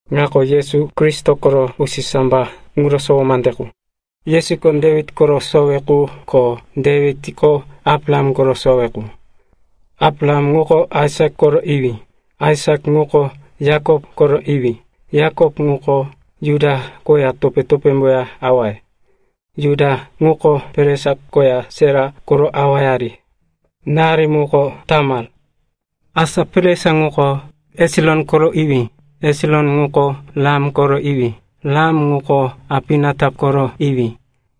Ŋako Yesu Kristo koro usisambayó ŋuro sowo mande qu. Yesuko Dewit koro sowe qu ko Dewitko Abraham koro sowe qu. Abraham ŋuko Aisak koro iwí. Aisak ŋuko Yakop koro iwí. Yakop ŋuko Juda koya topé-topémboya awaye. Juda ŋuko Peres koya Sera koro awayari. Náyari muko Tamar. Asa Peres ŋuko Hesiron koro iwí. Hesiron ŋuko Ram koro iwí. Ram ŋuko Aminatap koro iwí.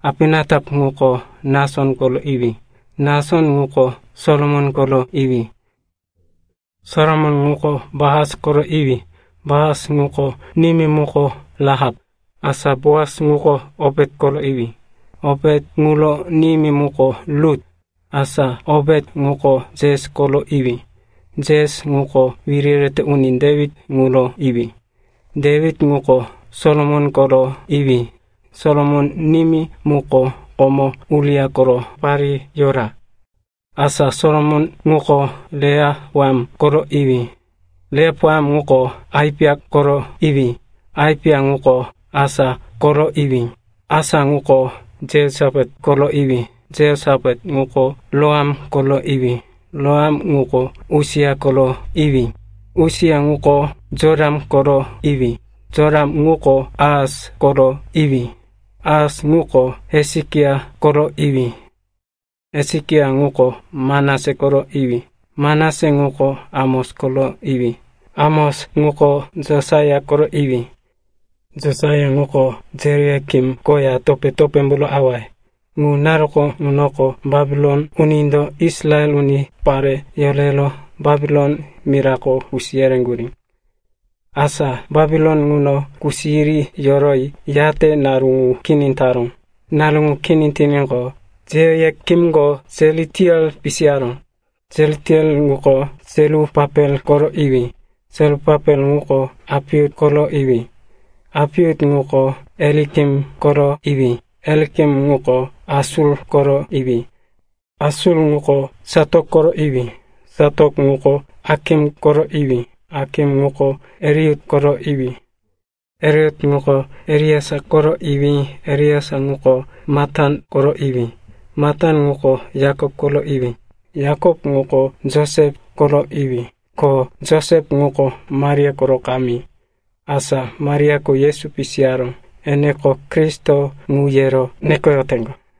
Aminatap ŋuko Nason koro iwí. Nason ŋuko Salamon koro iwí. Salamon ŋuko Boas koro iwí. Boas ŋuro nimí muko Rahap. Asa Boas ŋuko Opet koro iwí. Opet ŋuro nimí muko Rut. Asa Opet ŋuko Jesi koro iwí. Jesi ŋuko wiri yerete uni Dewit ŋuro iwí. Dewit ŋuko Solomon koro iwí. Solomon nimí ŋuko komo Uria koro parí yora. Asa Solomon ŋuko Rehopoam koro iwí. Rehopoam ŋuko Apiya koro iwí. Apiya ŋuko Asa koro iwí. Asa ŋuko Jehosapat koro iwí. Jehosapat ŋuko Joram koro iwí. Joram ŋuko Usia koro iwí. Usia ŋuko Jotam koro iwí. Jotam ŋuko Ahas koro iwí. Ahas ŋuko Hesekia koro iwí. Hesekia ŋuko Manase koro iwí. Manase ŋuko Amos koro iwí. Amos ŋuko Josaia koro iwí. Josaia ŋuko Jehoiakin koya topé-topémboro awaye. Ŋu naru ŋunoko Bapilon unindo Israel unipare yorero Bapilon mirako kusi yereŋgurí. Asa Bapilon ŋuno kusi yiri yoroyi, yate naru ŋu kini taró. Naru ŋu kini tiníqo, Jehoiakinko Sealitiel pisiyaró. Sealitiel ŋuko Serupapel koro iwí. Serupapel ŋuko Apiut koro iwí. Apiut ŋuko Eliakim koro iwí. Eliakim ŋuko Asoru koro iwí. Asoru ŋuko Satok koro iwí. Satok ŋuko Akim koro iwí. Akim ŋuko Eliuti koro iwí. Eliuti ŋuko Eleasar koro iwí. Eleasar ŋuko Matan koro iwí. Matan ŋuko Yakop koro iwí. Yakop ŋuko Josep koro iwí. Ko Josep ŋuko Maria koro kamí. Asa Mariako Yesu pisiyaró, eneko, “Kristo,” ŋu yero nekoyoteŋgo.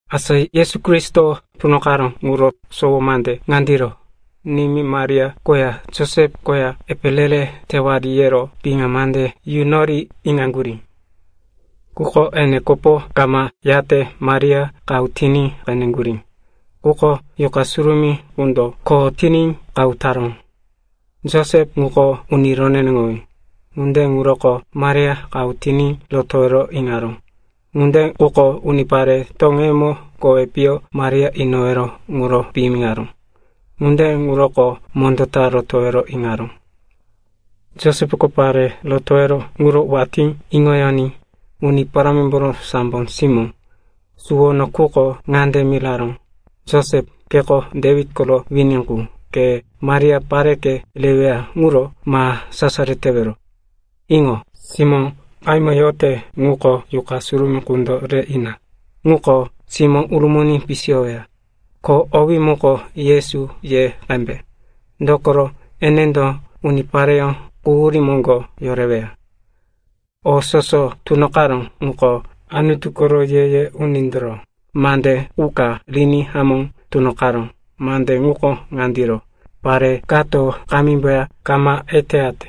Asa Yesu Kristo tunoqaró ŋuro sowo mande ŋandiro. Nimí Maria koya Josep koya, epe re-re tewari, yero piŋa mande yunori iŋaŋgurí. Quko ene kopo kama yate, Maria qahu tiní qeneŋgurí. Ŋuko Yuqa Surumí qundo kho tiní qahu taró. Josep ŋuko uni roneneŋowí. Ŋunde ŋuroko Maria qahu tiní rotowero iŋaró. Ŋunde quko unipare toŋeyemo kowi piyo Maria inowero ŋuro piyimiŋaró. Ŋunde ŋuro mondó ta rotowero iŋaró. Josepko pare rotowero ŋuro watí iŋoyoní, Uni Parámimboro sambo simómbo suwono quko ŋande miraró, “Josep, keko Dewit koro wini qu, ke Maria pareke reweya ŋuro ma sasaro tewero. Iŋo, simó qahímo yote ŋuko Yuqa Surumí qundo re ina. Ŋuko simó urumuni pisiyoweya. Ko owí muko Yesu ye qembe, dokoro enendo unipareyó quhuríye moŋgo yoreweya.” O soso tunoqaró ŋuko Anutu koro ye-ye unindoro mande qu ka riní hamó tunoqaró. Mande ŋuko ŋandiro, “Pare kato kamímboya kama eteyate,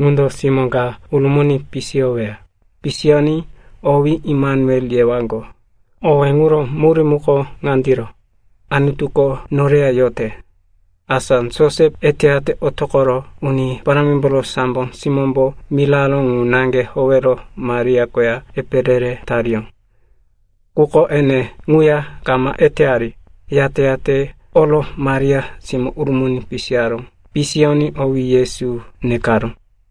ŋundo simó ka urumuni pisiyoweya. Pisiyoní owí Emanuel yewaŋgo.” (Owé ŋuro murí muko ŋandiro, “Anutuko noreya yote.”) Asa Josep eteyate otoqoro Uni Parámimboro sambo simómbo miraró ŋu naŋge howero Maria koya epe re-re tariyó. Quko ene ŋuya kama eteyari, yate-yate oro Maria simó urumuni pisiyaró. Pisiyoní owí Yesu nekaró.